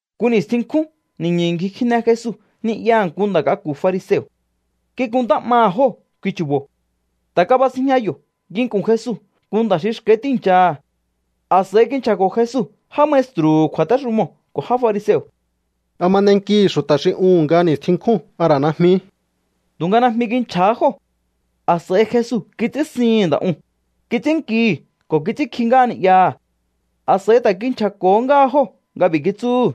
Nku ni̱stjin nkjún ni̱ñu̱ ngji kjine Jesu ni'yaha̱ nku nda̱ k'aku̱ fariseo̱. Kikuntá 'maha̱ jóo̱ kui chu̱bo̱. Ta̱ kabasinjña yo̱ nginku̱n Jesu nku nda̱ xi xka̱í tíi̱nchaha̱. A̱s'a̱i kinchja̱ko̱ Jesu já maestru̱hu̱ kju̱a̱téxumoo̱ ko̱ já fariseo̱: —¿A ma n'enkihi̱ xu̱ta̱ xi uhu̱n nga ni̱stjin nkjún, a ra̱ najmi? Tu̱nga najmi kinchja̱há jóo̱. A̱s'a̱i Jesu kits'ínsihi̱n nda̱ uu̱n, kits'ínnkihi̱ ko̱ kits'ínkji ngáha ni'yaha̱. A̱s'a̱i ta̱ kinchja̱ko̱hó ngáha jóo̱ nga b'i̱ kitsúhu̱: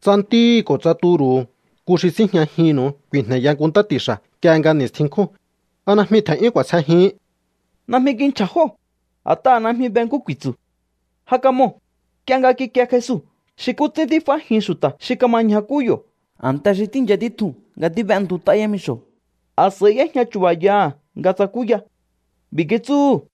—Tsa ntíhi̱ ko̱ tsa turu̱hu̱ nku xi síjñajinnu̱u ku̱i̱jne̱ya nku ntá ti̱xa̱ nk'ie nga ni̱stjin nkjún, ¿a najmi tje̱n'yún k'u̱a̱sjejihín? Najmi kinchja̱ jóo̱, a̱t'aha̱ najmi be nkú ku̱i̱tsu̱. Ja kamoo̱, nk'ie nga kikie Jesu xi nkú ts'ín tíf'ájin xu̱ta̱ xi kama ñjakú yo̱ a̱nte xi tíi̱ncha títjuu̱n nga tíb'entut'á yámixo̱, a̱s'a̱i y'éjña chu̱ba̱yaha̱ nga tsakúya. B'i̱ kitsúhu̱: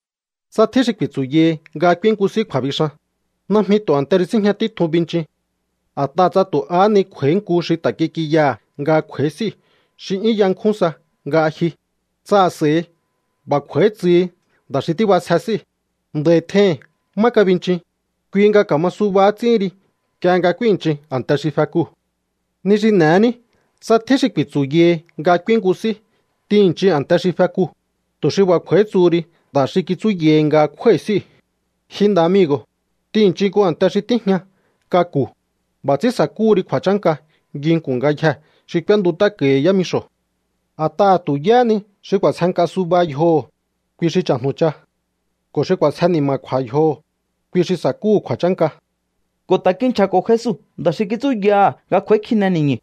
—Tsa tjín xi ku̱i̱tsu̱yahi nga k'úín nku s'í kju̱a̱bixan, najmi tu̱ a̱nte xi síjña títjuu̱n binchin. A̱t'aha̱ tsa tu̱ ahá ni kj'u̱a̱í nku xi ta̱ kik'inyaha̱ nga kj'u̱a̱í s'íu̱ xi 'yún yankjún sa nga ji, tsa a̱s'a̱i b'a̱ kj'u̱a̱í tsuhi nda̱ xi tíb'asje s'íu̱: “Nda̱i̱ tjehi̱n má kabinchin”, kui nga ka̱ma suba ts'íhin ri nk'ie nga k'úi̱nnchin a̱nte xi fekuu̱. Ni xi n'e̱ní tsa tjín xi ku̱i̱tsu̱yahi nga k'úín nku s'í, t'ihi̱nnchin a̱nte xi fekuu̱, tu̱ xi b'a̱ kj'u̱a̱í tsuhu ri nda̱ xi kitsúyahi nga kjúái̱ s'íu̱: “Ji nda̱ amigo̱, t'ihi̱nnchin nku a̱nte xi tíjña k'aku̱.” B'a̱ ts'ín sa̱kúhu ri kju̱a̱chánka nginku̱n ngayjee̱ xi k'úéntut'áko̱hi yámixo̱. A̱t'aha̱ tu̱ yáhá ni xi k'u̱a̱sje nk'a suba yjoho̱, kui xi cha̱jnu̱cha. Ko̱ xi k'u̱a̱sje ni̱ma̱kju̱a̱ yjoho̱, kui xi sa̱kúhu̱ kju̱a̱chánka. Ko̱ ta̱ kinchja̱ko̱ Jesu nda̱ xi kitsúyaha̱ nga kj'u̱a̱í kjine ni̱ñu̱.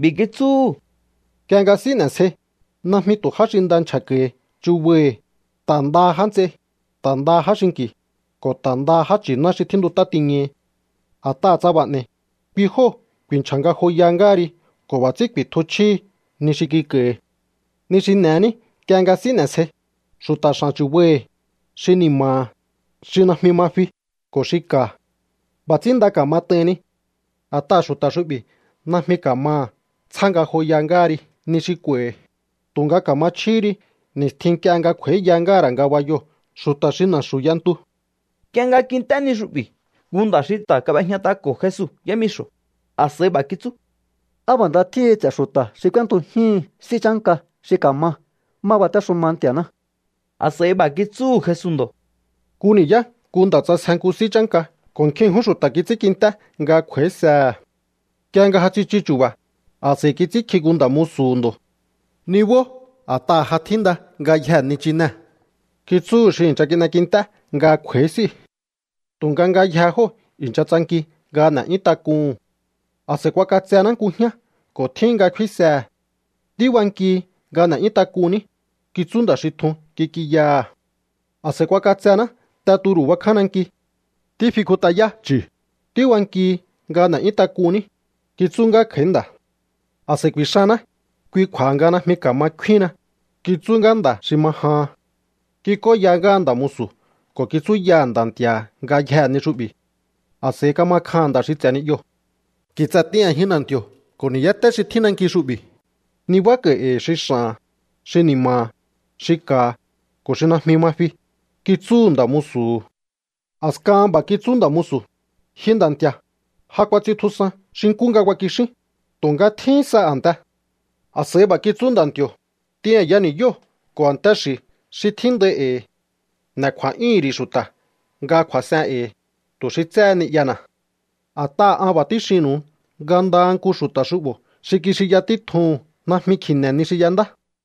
B'i̱ kitsúhu̱: —Nk'ie nga s'í n'e̱sjei, najmi tu̱ já xi nda nchja̱ko̱hi chubaihi̱, ta̱ ndaha já nts'ei, ta̱ ndaha já xinki̱, ko̱ ta̱ ndaha já nchi̱ná xi tjíntut'á tiñahi. A̱t'aha̱ tsa b'a̱ n'e̱i̱, kui jóo̱ ku̱i̱nchja̱ ngajoya ngáha ri ko̱ b'a̱ ts'ín ku̱i̱tju chjíhi ni xi kik'a̱i̱hi̱. Ni xi n'e̱ní nk'ie nga s'í n'e̱sjei, xu̱ta̱ x'a̱n chu̱baihi̱, xi ni̱ma̱ha̱, xi najmi ma fi ko̱ xi ka̱. B'a̱ ts'ín nda ka̱mat'aihinni. A̱t'aha̱ xu̱ta̱ xu'bi̱ najmi ka̱maha̱ tsjá ngajoya ngáha ri ni xi kj'u̱a̱i̱hi̱, tu̱nga ka̱ma chjíhí ri ni̱stjin nk'ie nga kj'u̱a̱íya ngáha̱ ra̱ ngabayoo̱ xu̱ta̱ xi na̱xu̱ y'entu. Nk'ie nga kint'é ni xu'bi̱ nku nda̱ xi ta̱ kab'ejñat'ako̱ Jesu yámixo̱, a̱s'a̱i b'a̱ kitsú: —¡Á b'a̱ nda tjíhin ts'e̱ xu̱ta̱ xi k'úéntujíhi̱n s'í chánka xi ka̱ma má batéxuma Nti̱a̱ná! A̱s'a̱i b'a̱ kitsúhu̱ Jesu ndo̱: —Nku ni̱yá nku nda̱ ts'asje nku s'í chánka ko̱ nkjin ṉkjún xu̱ta̱ kits'ínkint'é nga kj'u̱a̱ísehe̱. Nk'ie nga ja tsichu chu̱ba̱, a̱s'a̱i kits'ínkji nku nda̱ musu̱hu̱ ndo̱. “Nibó, a̱t'aha̱ ja tjínda ngayjee̱ nichinee̱”, kitsúhu̱ xi i̱ncha kin'ekint'é nga kj'u̱a̱í s'íu̱. Tu̱nga ngayjee̱ jóo̱ i̱ncha tsanki nga n'e̱'yún tak'uhu̱n. “A̱s'a̱i kuak'atsená nku jñá ko̱ tjíhin nga kfínsehe̱. Tíbankihi nga n'e̱'yún tak'unní”, kitsú nda̱ xi tjun kik'inyaha̱. “A̱s'a̱i kuak'atsená te turu̱ bakján nanki. Tífikjut'ayá chu̱. Tíbankihi nga n'e̱'yún tak'unní”, kitsú ngá kj'a̱í nda̱. “A̱s'a̱i kuixanná, kui kju̱a̱ha nga najmi ka̱ma kfíhinna”, kitsú ngá nda̱ xi ma jahan. ’Kik'óya ngáha nda̱ musu̱ ko̱ kitsúyaha̱ nda̱ nti̱a̱ha̱ ngayjee̱ ni xu'bi̱. A̱s'a̱i kama kjaha̱n nda̱ xi ts'e̱ ni'yoo̱. “Ki̱tsa̱ t'in a̱jin na̱nti̱o̱ ko̱ ni̱yáté xi tjín nanki xu'bi̱. Nibáko̱i̱ e̱i̱ xi x'a̱ha̱n, xi ni̱ma̱ha̱, xi ka̱ha̱, ko̱ xi najmi ma fi”, kitsúhu̱ nda̱ musu̱hu̱. A̱skahan b'a̱ kitsú nda̱ musu̱: “Ji nda̱ nti̱a̱, ja kuats'intjusan xi nkú nga kuakixín, tu̱nga tjíhín sa a̱nte.” A̱s'a̱i b'a̱ kitsú nda̱nti̱o̱: “T'in a̱ya ni̱yóo̱ ko̱ a̱nte xi̱ xi tjíndai e̱i̱. N'e̱ kju̱a̱'yúhu̱n ri̱ xu̱ta̱ nga kju̱a̱s'en e̱i̱, tu̱ xi tséhe ni'yana̱. A̱t'aha̱ an b'a̱ tíxinnu̱u nga ndaha nku xu̱ta̱ xu'bo̱ xi kixinya títjuhu̱n najmi kji̱ne̱ ni xi y'endá.”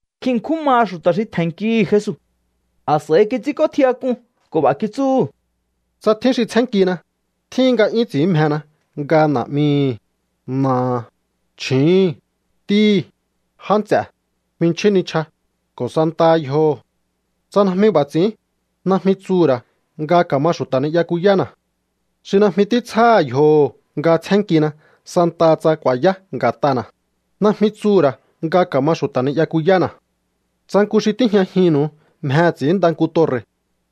Nkjin ṉkjún maha xu̱ta̱ xi tje̱nnkihi̱ Jesu. A̱s'a̱i kits'ínk'ótjiyak'un ko̱ b'a̱ kitsúhu̱: —Tsa tjín xi tsjénnkina, tjíhin nga 'yún ts'i̱ín mjena nga na̱'mihi̱, na̱aha̱, chju̱úhu̱n, ntíhi̱, já nts'e̱, jminchjín nichja, ko̱ santaha yjoho̱. Tsa najmi b'a̱ ts'i̱ín, najmi tsuhu̱ ra̱ nga ka̱ma xu̱ta̱ ni'yakuyána̱. Xi najmi títsjáha̱ yjoho̱ nga tsjénnkina santaha tsa ku̱a̱yá nga̱t'ana̱, najmi tsuhu̱ ra̱ nga ka̱ma xu̱ta̱ ni'yakuyána̱. ’Tsa nku xi tíjñajinnu̱u mjehe̱ ts'i̱ínnda nku torre̱,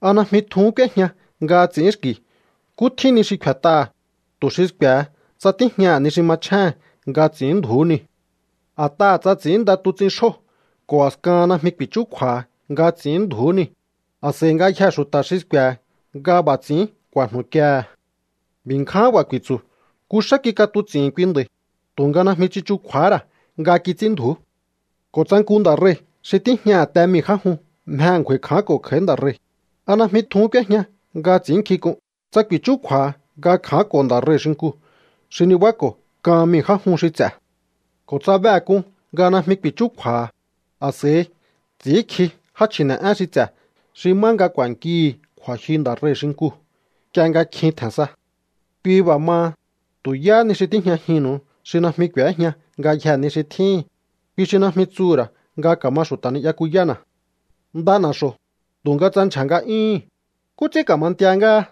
¿a najmi tjuhún k'úéjña nga ts'i̱ínxki̱ nkú tjín ni xi kfe̱t'aha̱, tu̱ xi sku̱e̱he tsa tíjñaha̱ ni xi machjéhe̱n nga ts'i̱ínndju̱ú niu̱? A̱t'aha̱ tsa̱ ts'i̱ínnda tuts'in xjóo̱ ko̱ a̱skahan najmi ku̱i̱chúkju̱a̱ha̱ nga ts'i̱ínndju̱ú niu̱, a̱s'a̱i ngayjee̱ xu̱ta̱ xi sku̱e̱he̱ nga b'a̱ ts'i̱ín ku̱a̱jnu̱kiehe̱. B'i̱ ngján b'a̱ ku̱i̱tsu̱: “Nku xá kik'atuts'i̱hi̱n kui nda̱i̱, tu̱nga najmi tsichukju̱a̱há ra̱ nga kits'ínndju̱ú.” ’Ko̱ tsa nku nda̱ rei̱ xi tíjñaha̱ te mii̱ já jun mjehe̱ ngju̱a̱i̱ kjánko̱ kj'a̱í nda̱ rei̱, ¿a najmi tjuhún k'úéjña nga ts'i̱ínnkjink'un tsa ku̱i̱chúkju̱a̱ha̱ nga kja̱ánko̱ nda̱ rei̱ xinkuu̱ xi nibáko̱ kan mii̱ já jun xi ts'e̱? Ko̱ tsa behe̱ k'un nga najmi ku̱i̱chúkju̱a̱ha̱, a̱s'a̱i ts'i̱ínkji já chji̱ne̱'én xi ts'e̱ xi má nga ku̱a̱nkihi̱ kju̱a̱jyu nda̱ rei̱ xinkuu̱ nk'ie nga kjin tje̱n sa. Kui b'a̱ maha, tu̱ yáhá ni xi tíjñajinnu̱u xi najmi k'u̱éjña ngayjee̱ ni xi tjíhi̱n, kui xi najmi tsuhu̱ ra̱ nga ka̱ma xu̱ta̱ ni'yakuyána̱. ’Nda na̱xo̱, tu̱nga tsa ndyja̱ nga'yúhu̱n, ¿nkú ts'ín ka̱ma ntia ngáha?